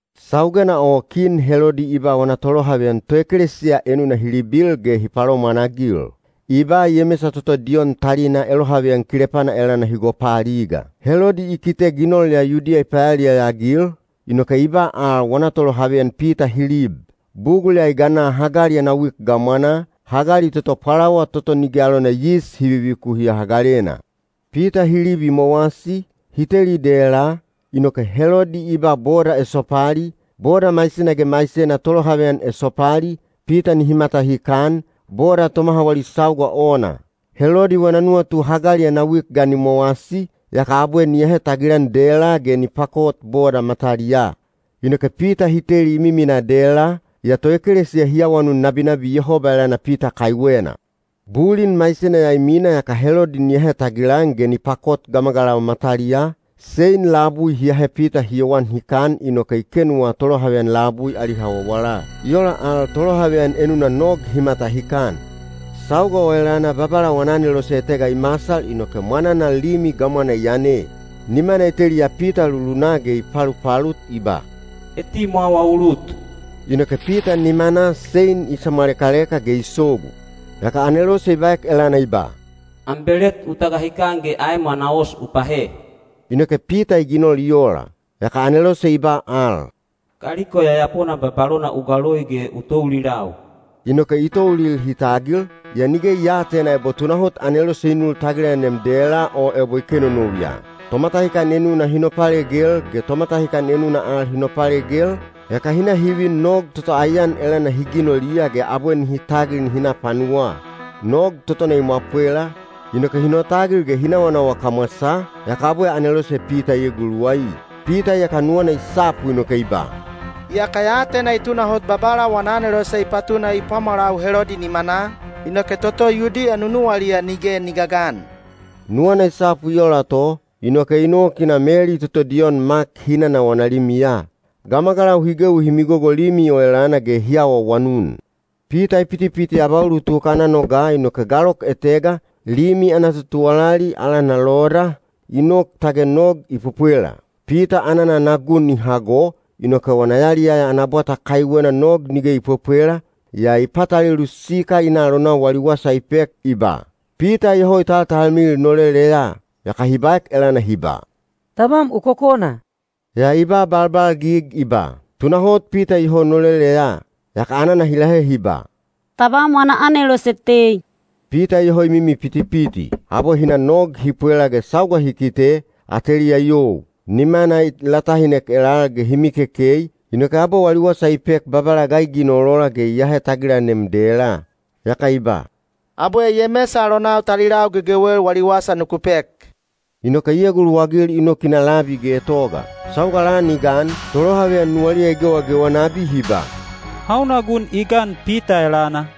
Saugena o kin Helodi i ba wana tolohaveyan toekelesiya enuna hi libil ge hi palomwanagil. I ba Yemesa toto Diyon talina elohaveyan kilepana elana hi gopaaliga. Helodi i kite ginol ya Yudiya i payaliyaya-agil, inoke i ba al wana tolohaveyan Pita hi lib. Bugul ya i gana hagali ana wik gamwanaa, hagali toto Pwalawa toto Nige alona Yis Hi Vivikuhiya Hagalena. Pita hi lib i mowasi, hi teli dela, inoke Helodi i ba boda esopali, boda maisena ge maisena tolohaveyan esopali, Pita nihi matahikan, boda tomaha wali sauga ona. Helodi wana nuwatu hagali ana wik ga ni mowasi, yaka abwe ni ahe tagilan dela ge ni pakot boda mataliyaa. Inoke Pita hi teli i miminaa dela, yaa toekelesiya hi awanun nabinabi Yehoba elana Pita kaiwena. Bulin maisena ya i mina yaka Helodi ni ahe tagilan ge ni pakot gamagalau mataliyaa, sein labui hi ahe Pita hi yowan hikan inoke i kenuwa tolohaveyan labui ali hawawala. I ola al tolohaveyan enuna nog hi matahikan. Sauga o elana Babala wana anelose etega i masal inoke mwananal limi gamwana i yane. Nimana i teliya Pita lulunaa ge i palupalut i ba, “Etimwawa u lut!” Inoke Pita nimanaa sein i samwaleleka ge i sogu. Yaka anelose i baek elana i ba, “Am belet u tagahikan ge aem ana os u pahe.” Inoke Pita i ginol i ola. Yaka anelose i ba al, “Kaliko yayapona babalona u galoi ge u toulilau.” Inoke i toulil hi tagil, yaa nige i aatena ebo tunahot anelose i nul tagilanem dela o ebo i kenonou ya. Tomatahikan enuna hi nopalegel ge tomatahikan enuna al hi nopalegel, yaka hi na hi vin nog toto aiyan elana hi ginoliya ge abwe nihi tagil nihi na panuwaa. Nog totona i mwapwela, inoke hi notagil ge hi nawanawa kamwasaa, yaka abwe anelose Pita i eguluwai. Pita iyaka nuwana i sapu inoke i ba, “Iyaka ya atena i tunahot Babala wana anelose i patuna i pwamwalau Helodi nimanaa, inoke toto Yudiya nunuwaliya nige ni gagan.” Nuwana i sapu i ola to, inoke i nok i na Meli toto Diyon Mak hinana wana limiya. Gamagalau hi gewi hi migogo limi o elana ge hi awaawanun. Pita i pitipiti abaulutuk ana noga inoke galok etega, limi ana totuwalali, alana Loda, i nok tage nog i pwepwela. Pita anana ana gun i hago, inoke wana yaliyaya ana bwata kaiwena nog nige i pwepwela, yaa i patalelu sikal i na alonau wali wasa i pek i ba, “Pita iyoho i taltalmilil noleleya.” Yaka hi baek elana hi ba, “Tabam u kokona.” Yaa i ba balbalgig i ba, “Tunahot Pita iyoho noleleya.” Yaka anana hi lahe hi ba, “Tabam wana anelose tei!” Pita iyoho i mimi pitipiti. Abwe hi na nog hi pwela ge sauga hi kite, ateliya i you. Nimana i latahinek elal ge hi mikekei, inoke abwe wali wasa i pek Babala ga i ginol ola ge i ahe tagilanem dela. Yaka i ba, “Abwe Yemesa alonau talilau gegewel wali wasa nuku pek,” inoke i eguluwagil i nok i na labi getoga. Sauga lan i gan, tolohaveyan nuwaliya i gewagewa nabi hi ba, “Hauna gun i gan Pita elana?”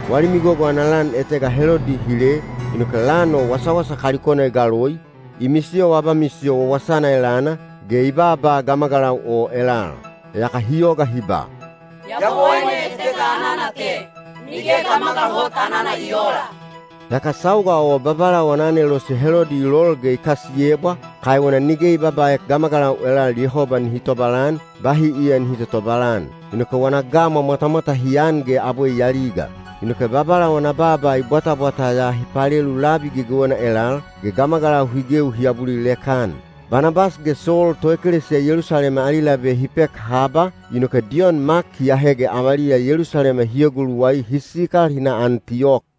Wali migogo ana lan etega Helodi i hile, inoke lan o wasawasa kalikona i galoi, i misiyowa abamisiyo wawasana elana, ge i baaba gamagalau o elal. Yaka hi yoga hi ba, “Yabowaine etega anana te, nige gamagal hot anana i oola.” Yaka sauga o Babala wana anelose Helodi i lol ge i kasiyebwa, kaiwena nige i babaaek gamagalau elal Yehoba nihi tobalan, bahi iya nihi totobalan. Inoke wana gamwa mwatamwata hi an ge abwe i aliga. Inoke Babala wana baaba i bwatabwata ya hi palelu labi gegewena elal, ge gamagalau hi gewi hi abulilek-an. Banabas ge Sol toekelesiya Yelusalema ali labe hi pek haba, inoke Diyon Mak hi ahe ge avaliya Yelusalema hi eguluwai hi sikal hi na Antiyok.